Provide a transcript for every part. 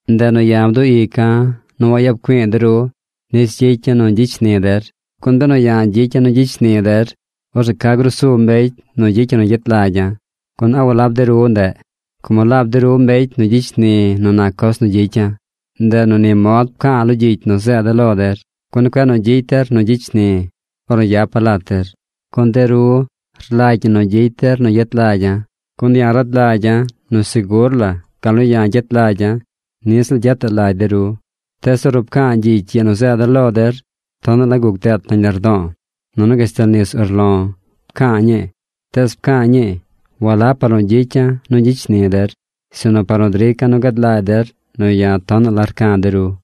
Ndeꞌ nu ya̱ bduꞌ ica̱ nu wayap güi̱i̱ de ru nis gyicya̱ nu gyicy shni der. Gun benu ya̱ gyicya̱ nu gyicy shni der, orzeꞌ ¿ca grusu mbecy nu gyicy yu nu gyet lagya̱? Gun ¿a walab de ru ndeꞌ? Como laab de ru mbecy nu gyicy shni nu nac coz nu gyicya̱. Ndeꞌ nu ni mod pca̱a̱ lo gyicy nu zeeda̱ lo der, gun cueꞌ nu gyicy der nu gyicy shni̱ ornu yapa̱ lat der. Gun de ru lagy ñi nu gyicy der nu gyet lagya̱. Gun ya̱ rad lagya̱ nu segur la gal nu ya̱ gyet lagya̱, niꞌ ziꞌl gyetaꞌ lagy de ru. Tees ornu pca̱a̱ gyicy ii nu zeeda̱ lo der, tonaꞌ la guc deet nañ lardo̱o̱, nunu gashtal nis urlo̱ pca̱a̱ ñii. Tees pca̱a̱ ñii walab par nu gyicya̱ nu gyicy shni der, sinu par nu drica̱ nu gad lagy der nu ya̱ tonaꞌ la rca̱ de ru.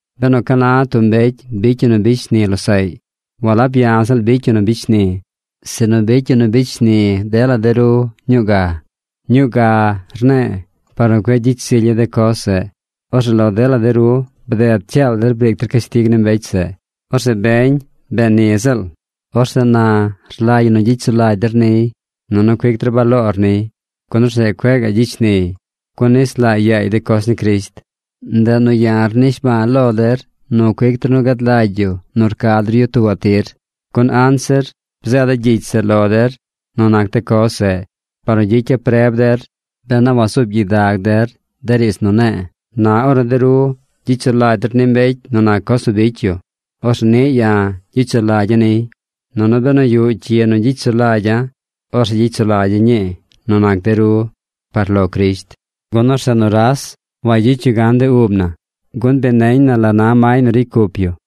Benu ca na tub mbecy bicy yu nu bicy shni losaꞌy, walab ya̱ ziꞌl bicy yu nu bicy shni̱, sinu bicy yu nu bicy shni dela de ru ñuu ga. “Ñuu ga” rne̱e̱ par nu cueꞌ gyicy zilya̱ de coz zeꞌ. Orzeꞌ lo dela de ru bded cyaal der briic der cashtig ni mbecy zeꞌ. Orzeꞌ beñ bee ni ziꞌl. Orzeꞌ na rlagy ñi nu gyicy sulagy der niy, nunu cuic der baloor niy, gun orzeꞌ cueꞌ gaꞌ gyicy shniy. Gun nis laa yaay de coz ni Crisht. Ndeꞌ nu ya̱ rnishba̱a̱ lo der nu cuic der nu gad lagy yu nu rca der yu tuubaꞌ tir. Gun anzir bzeeda̱ gyicy zeꞌ lo der nu nac de coz zeꞌ, par nu gyicya̱ preb der ben a wazuub gyidag der de riidz nu ne̱e̱. Na ornu de ru gyicy sulagy der ni mbecy nu nac coz nu bicy yu, orzeꞌ niꞌ ya̱ gyicy sulagya̱ niy. Nunu benu yuꞌ cyi nu gyicy sulagya̱, orzeꞌ gyicy sulagya̱ ñii nu nac de ru par lo Crisht, gun orzeꞌ nuras wagyicy yu gan de ub na, gun bi neñ na la na may nu ricy cup yu.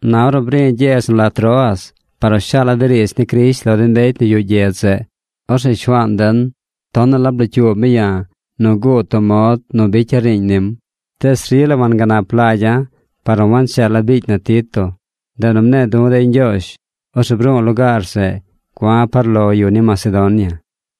Na ornu bri̱ gyedz nu la Troas par nu shaala̱ de riidz ni Crisht lo de mbecy nu yuꞌ gyedz zeꞌ, orzeꞌ Shuaan den tonaꞌ la blocyuub mi ya̱ nu guud tub mod nu bicya̱ riiñ nim. Tees rila wanganap lagya̱ par nu wancheela̱ biicy na Tito. Ndeꞌ nu mne̱e̱ du̱ dey ñgyoozh. Orzeꞌ bru̱u̱ lugaar zeꞌ gua̱ par lo de yu ni Macedonia.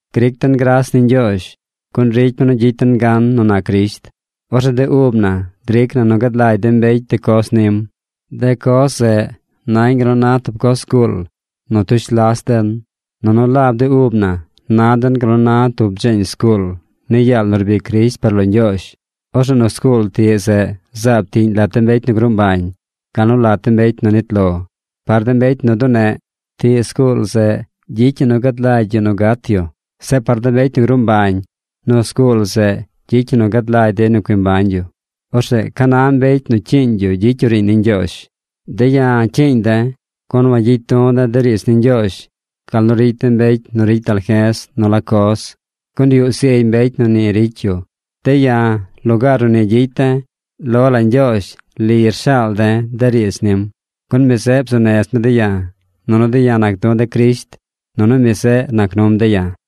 Gric den gras ni Ñgyoozh, gun ricy mi nu gyicy den gan nu nac Crisht. Orzeꞌ de ub na dric na nu gad lagy de mbecy de coz nim. De coz zeꞌ nañ gal nu na tub coz zguul nu tush las den. Nunu laab de ub na na den gal nu na tub dzeeñ zguul ni yaal nu rbic Crisht par lo Ñgyoozh. Orzeꞌ nu zguul tiꞌ zeꞌ zaab tiꞌñ lat de mbecy nu gruu mbañ, gal nu lat de mbecy nu nit lo. Par de mbecy nu duneꞌ, tiꞌ zguul zeꞌ gyicy ñi nu gad lagy yu nu gat yu. Zeꞌ par de yu nu gruu mbañ, nu zguul zeꞌ gyicy ñi nu gad lagy dey nu cui mbañ yu. Orzeꞌ ¿ca na mbecy nu cyiiñ yu gyicy yu riiñ ni Ñgyoozh? De̱ ya̱ cyiiñ de̱, gun wagyicy du̱ de̱ de riidz ni Ñgyoozh gal nu ricy de mbecy nu ricy dalje̱z nu la coz, gun yuꞌ zigy mbecy nu ni ricy yu. De̱ ya̱, lugaar nu ni gyicy de̱, lo la Ñgyoozh li rshaal de̱ de riidz nim. Gun mi zeꞌ bzuu nez mi de̱ ya̱, nunu de̱ ya̱ nac du̱ de̱ Crisht nunu mi zeꞌ nac num de̱ ya̱.